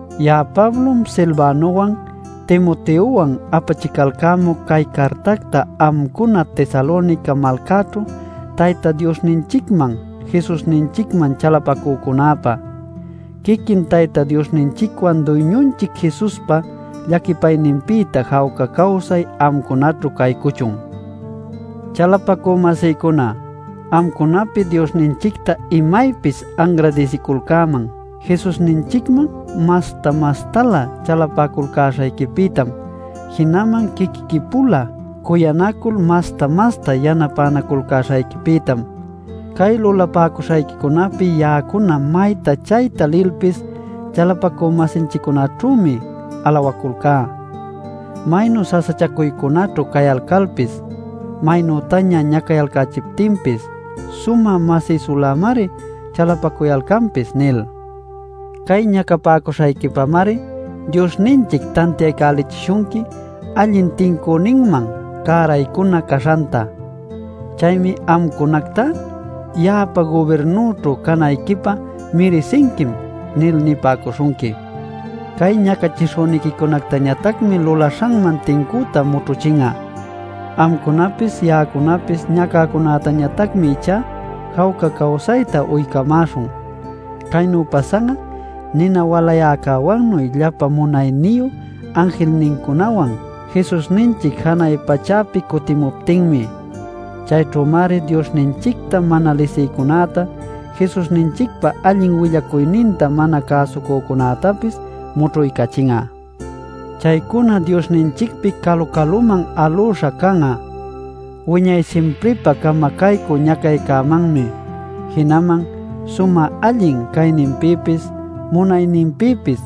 Ya'a Pablom, Silvanowan, Timoteowan apachicalcämuc cay cartacta amcuna Tesalonica malcaćhu Tayta Diosninchicman Jesusninchicman chalapacücunäpä. Quiquin Tayta Diosninchicwan Duyñunchic Jesuspa llaquipayninpïta jawca cawsay amcunaćhu caycuchun. Chalapacü-masïcuna, amcunapi Diosninchicta imaypis anradisiculcäman Jesusninchicman masta-mastalä chalapaculcäśhayquipïtam, jinaman quiquiqui-pula cuyanacul masta-masta yanapänaculcäśhayquipïtam. Cay lulapäcuśhayquicunapi ya'acuna mayta chayta lilpis chalapacü-masinchiccunaćhümi alawaculcá: “Maynu sasachacuycunaćhu cayalcalpis, maynütaña ñacachipäcuptinpis, sumä masïsulämari chalapacuyalcanpis” nil. Cay ñacapäcuśhayquipamari Diosninchic tantiaycachipäcuśhunqui allin tincüninman cäraycunan caśhanta. Chaymi amcunactá “Ya'apa gubirnüćhu canayquipä mirisinquim” nil nipäcuśhunqui. Cay ñacachishüniquicunactañatacmi lulaśhanman tincüta mućhuchin'a. Amcunapis ya'acunapis ñacäcunätañatacmi ichá jawca cawsayta uycamäśhun. Caynu pasan'a nina walayäcäwannuy llapa munayniyu anjilnincunawan Jesusninchic janay pachäpi cutimuptinmi. Chayćhümari Diosninchicta mana lisïcunäta Jesusninchicpa allin willacuyninta mana cäsucücunätapis mućhuycachin'a. Chaycuna Diosninchicpi calu-caluman alüśha can'a wiñay simpripä camacaycü ñacaycämanmi, jinaman sumä allin cayninpïpis munayninpïpis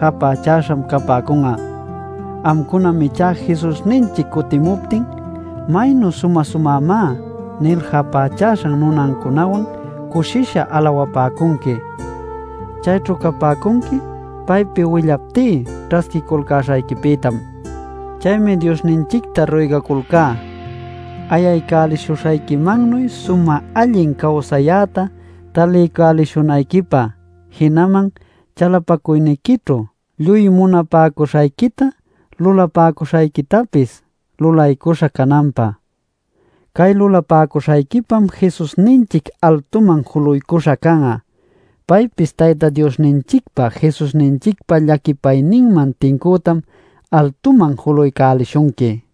japächäśham capäcun'a. Amcunam ichá Jesusninchic cutimuptin: “Maynu sumä-sumämá” nil japächäśhan nunancunawan cushisha alawapäcunqui. Chayćhu capäcunqui paypi willaptí ćhasquiculcäśhayquipïtam. Chaymi Diosninchicta ruygaculcá ayaycälishuśhayquimannuy sumä allin cawsayäta taliycälishunayquipä, jinaman chalapacuyniquićhu lluy munapäcuśhayquita lulapäcuśhayquitapis lulaycuśha cananpä. Cay lulapäcuśhayquipam Jesusninchic altuman juluycuśha can'a. Paypis Tayta Diosninchicpa Jesusninchicpa llaquipayninman tincütam altuman julaycälishunqui.